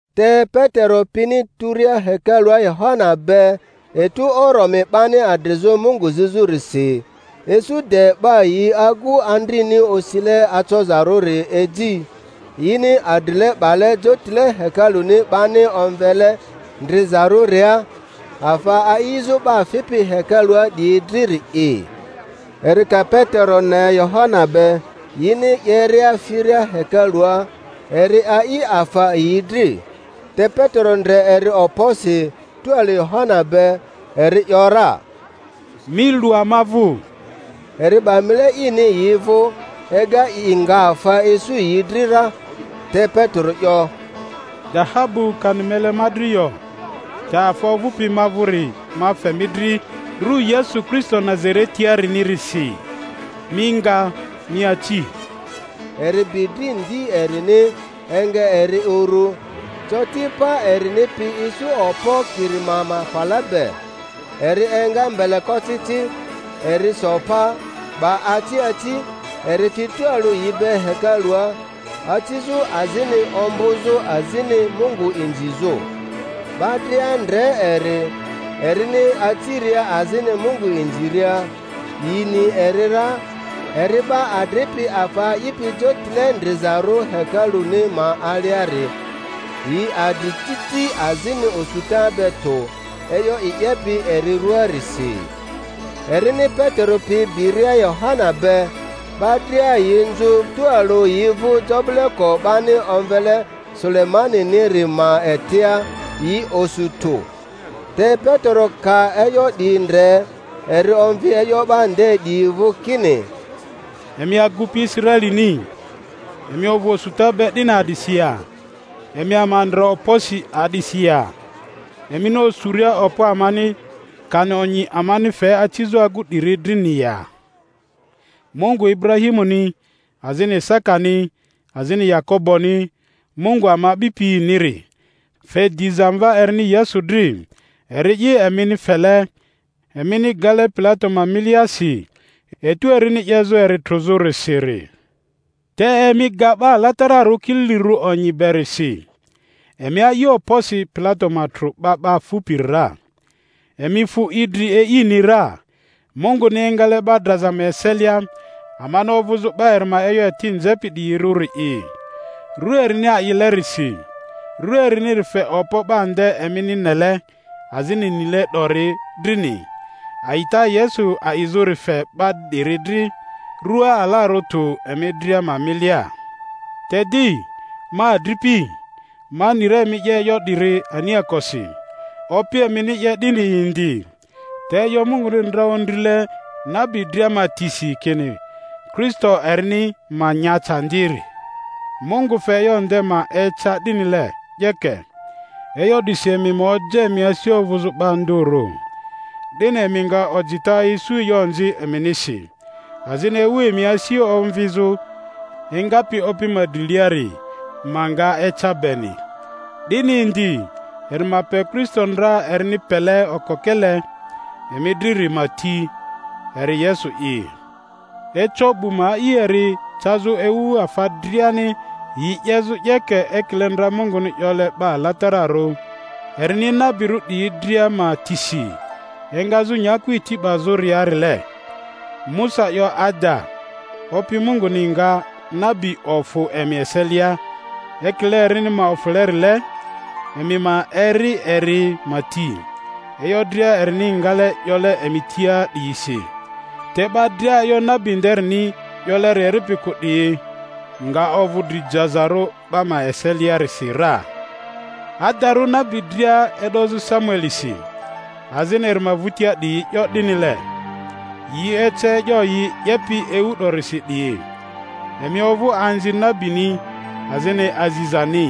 Te Petero pini turia hekalua Yohana be etu oromi 'bani adrizᴜ Mungu zizᴜrisi, isu de 'ba yi agu andrini osile acozarᴜri eji, yini adrile 'bale jotile hekaluni 'bani omvele Ndrizarᴜria, afa a'izᴜ 'ba fipi hekalua 'diyi driri'i. Eri ka Petero ne Yohana be yini 'yeria firia hekalua, eri a'i afa yi dri. Te Petero ndre eri okposi tualᴜ Yohana be, eri ‘yora, Mi lu ama vᴜ. Eri 'ba mile ini yi vᴜ, ega i nga afa isu yi dri ra. Te Petero 'yo, Dahabu kani mele ma dri yo, te afa ovᴜpi ma vᴜri ma fe mi dri; ru Yesu Kristo Nazaretiarinisi, mi nga, mi aci. Eri bi dri ndi erini, enga eri uru; coti pa erini pi isu okpo kirima ma fala be. Eri enga mbelekocici, eri so pa, 'ba aci aci; eri fi tualᴜ yi be hekalua, acizᴜ azini ombᴜ-zᴜ azini Mungu inzizᴜ. 'Ba dria ndre eri, erini aciria azini Mungu inziria; yi ni eri ra, eri 'ba adripi afa a'ipi Jotile Ndrizarᴜ hekaluni ma aliari; yi adri titi azini osuta be tᴜ e'yo i 'yepi eri ruaarisi. Erini Petero pi biria Yohana be, 'ba dria yi nzᴜ tualᴜ yi vᴜ jobi-leko 'bani omvele Sulemaniniri ma etia, yi osu tᴜ. Te Petero ka e'yo 'di ndre, eri omvi e'yo 'ba nde 'diyi vᴜ kini, Emi agupi Israelini, emi ovᴜ osuta be 'dini a'disi ya? Emi ama ndre okposi a'disi ya, emini osuria okpo amani kani onyi amani fe acizᴜ agu 'diri drini ya? Mungu Iburahimuni azini Isakani azini Yakoboni, Mungu ama a'bipi-niri fe diza Mva erini Yesu dri; eri'i emini fele, emini gale Pilato ma miliasi etu erini 'yezᴜ eri trᴜzᴜrisiri. Te emi ga 'Ba Alatararᴜ Kililirᴜ Onyi beri si, emi a'i okposi Pilato ma trᴜ 'ba 'ba fupiri ra, emi fu idri E'ini ra, Munguni engale 'ba draza ma eselia, amani ovᴜzᴜ 'ba eri ma e'yo eti nzepi 'diyirᴜri'i. Ru erini a'ilerisi, ru eriniri fe okpo 'ba nde emini nele azini nile 'dori drini; a'ita Yesu a'izᴜri fc 'ba 'diri dri rua alarᴜ tᴜ emi dria ma milia. Te di, ma adripi, ma ni ra emi 'ye e'yo 'diri aniakosi, opi emini 'ye'dini indi. Te e'yo Munguni ndra ondrile nabi dria ma tisi kini Kristo erini ma nya candiri, Mungu fe e'yo nde ma eca 'dinile 'yeke. E'yo 'disi emi ma oja emi asi ovᴜzᴜ 'ba ndᴜrᴜ, 'dini emi nga ojita isu e'yo onzi eminisi, azini ewu emi asi omvizᴜ engapi Opi ma driliari ma nga eca beni; 'dini indi eri ma pe Kristo ndra erini pele okokele emi driri ma ti, eri Yesu'i. Eco 'bu ma a'i eri cazᴜ ewu afa driani yi 'yezᴜ 'yeke ekile ndra Munguni 'yole 'ba alatararᴜ erini nabirᴜ 'diyi dria ma tisi engazᴜ nyaku eti 'bazᴜriarile. Musa 'yo ada, Opi Munguni nga nabi ofᴜ emi eselia ekile erini ma ofᴜlerile; emi ma eri eri ma ti e'yo dria erini ngale 'yole emi tia 'diyisi. Te 'ba dria e'yo nabi nderini 'yoleri eripi kᴜ 'diyi nga ovᴜ dri jazarᴜ 'ba ma eseliarisi ra. Adarᴜ nabi dria e'dozᴜ Samuelisi azini eri ma vᴜtia 'diyi 'yo 'dinile, yi ece e'yo yi 'yepi ewu 'dorisi 'diyi. Emi ovᴜ anzi nabini azini azizani,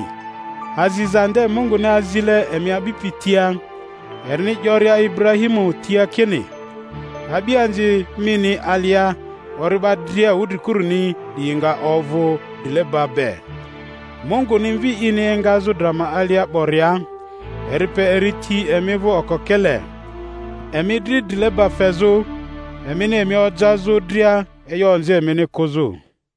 aziza nde Munguni azile emi a'bipi tia, erini 'yoria Iburahimu tia kini, A'bianzi mini alia ori'ba dria wudrikuruni 'diyi nga ovᴜ drileba be. Munguni Mvi ini engazᴜ dra ma alia 'boria, eri pe eri ti emi vᴜ okokele, emi dri drileba fezᴜ, emini emi ojazᴜ dria e'yo onzi emini kᴜzᴜ.